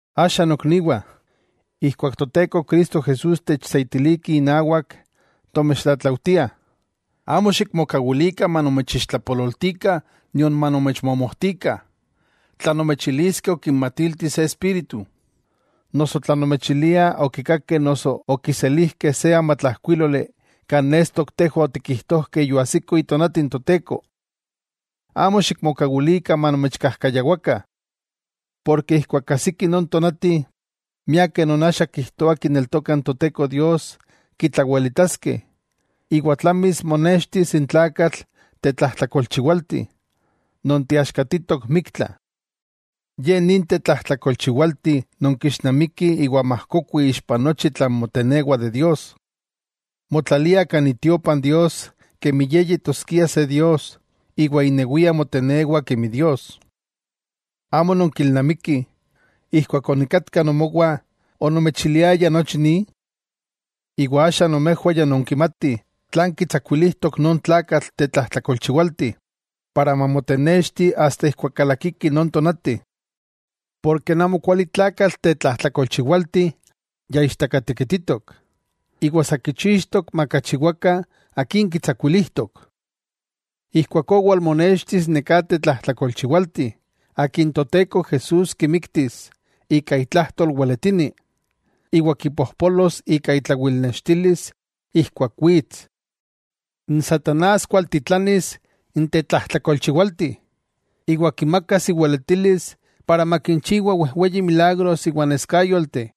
Axa nokniwah, ijkuak Toteko Cristo Jesús techseitilikih inawak, tomechtlatlaujtiah amo xikmokawilikah manomechixtlapololtikah nion manomechmomojtikah, tla nomechiliskeh okinmatilti se espíritu, noso tla nomechiliah okikakeh noso okiselijkeh se amatlajkuíloli kan nestok tejwah otikijtojkeh yoajsiko itonati n Toteko. ¡Amo xikmokawilikah manomechkajkayawakah! Porke ijkuak ajsiki non tonati, miakeh non axa kijtoah kineltokah n Toteko Dios, kitlawelitaskeh, iwa tlamis monextis n tlakatl tetlajtlakolchiwalti, non teaxkatitok miktla. Ye nin tetlajtlakolchiwalti non kixnamiki iwa majkokui ixpa nochi tlan motenewa de Dios. Motlalia kan itiopa n Dios kemi ye yetoskia se dios iwa inewia motenewa kemi dios. ¿Amo nonkilnamikih, ijkuak onikatka nomowah onomechiliaya nochi ni? Iwa axa nomejwah ya nonkimatih tlan kitsakuilijtok non tlakatl tetlajtlakolchiwalti, para mamotenexti asta ijkuak kalakiki non tonati. Porke n amokualitlakatl tetlajtlakolchiwalti ya ichtakatekititok; iwa sa kichixtok makachiwakah akin kitsakuilijtok. Ijkuakó walmonextis neká tetlajtlakolchiwalti, akin Toteko Jesús kimiktis ika itlajtol weletini, iwa kipojpolos ika itlawilnextilis ijkuak wits. N satanás kualtitlanis n tetlajtlakolchiwalti, iwa kimakas iweletilis para makinchiwa wejweyi milagros iwa neskáyolteh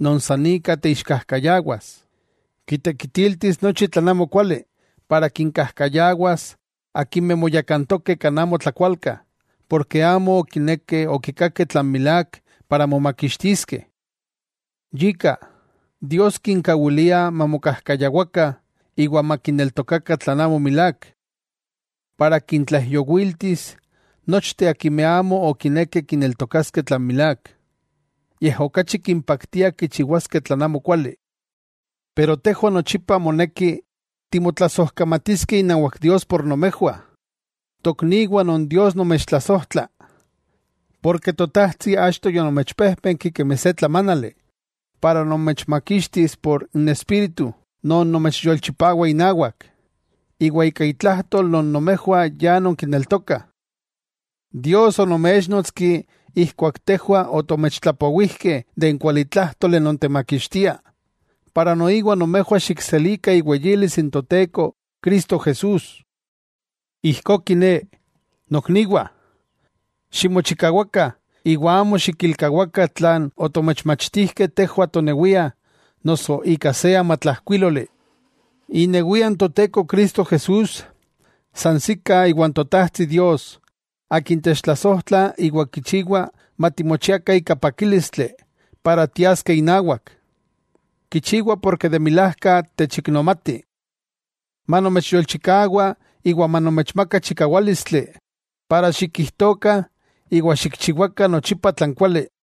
non san ika teixkajkayawas. Kitekitiltis nochi tlan amokuali para kinkajkayawas akimeh moyakantokeh kan amo tlakualka porke amo okinekeh okikakeh tlan milák para momakixtiskeh. Yika, Dios kinkawilia mamokajkayawakah iwa makineltokakah tlan amo milák, para kintlaijyowiltis nochteh akimeh amo okinekeh kineltokaskeh tlan milák, yej okachi kimpaktia kichiwaskeh tlan amokuali. Tejwah nochipa moneki timotlasojkamatiskeh inawak Dios por nomejwah, tokniwah non Dios nomechtlasojtla. Porke Totajtsi achto yonomechpéjpenki kemi se tlamánali para nomechmakixtis por n Espíritu non nomechyolchipawa inawak, iwa ika itlajtol non nomejwah ya nonkineltokah. Dios onoméchnotski ijkuak tejwah otomechtlapowijkeh n kualitlájtoli non temakixtia, iwa ijkó nomejwah xikselikah iweyilis n Toteko Cristo Jesús. Ijkó kiné, nokniwah, ximochikawakah, iwa amo xikilkawakah tlan otomechmachtijkeh tejwah tonewiah noso ika se amatlajkuíloli. Inewia n Toteko Cristo Jesús, sansikah iwa n Totajtsi Dios, Akin techtlasojtla iwa kichiwa matimochiakah ika pakílistli para tiaskeh inawak, kichiwa porke de milajka techiknomati, manomechyolchikawa iwa manomechmaka chikawálistli para xikijtokah iwa xikchiwakah nochipa tlan kuali.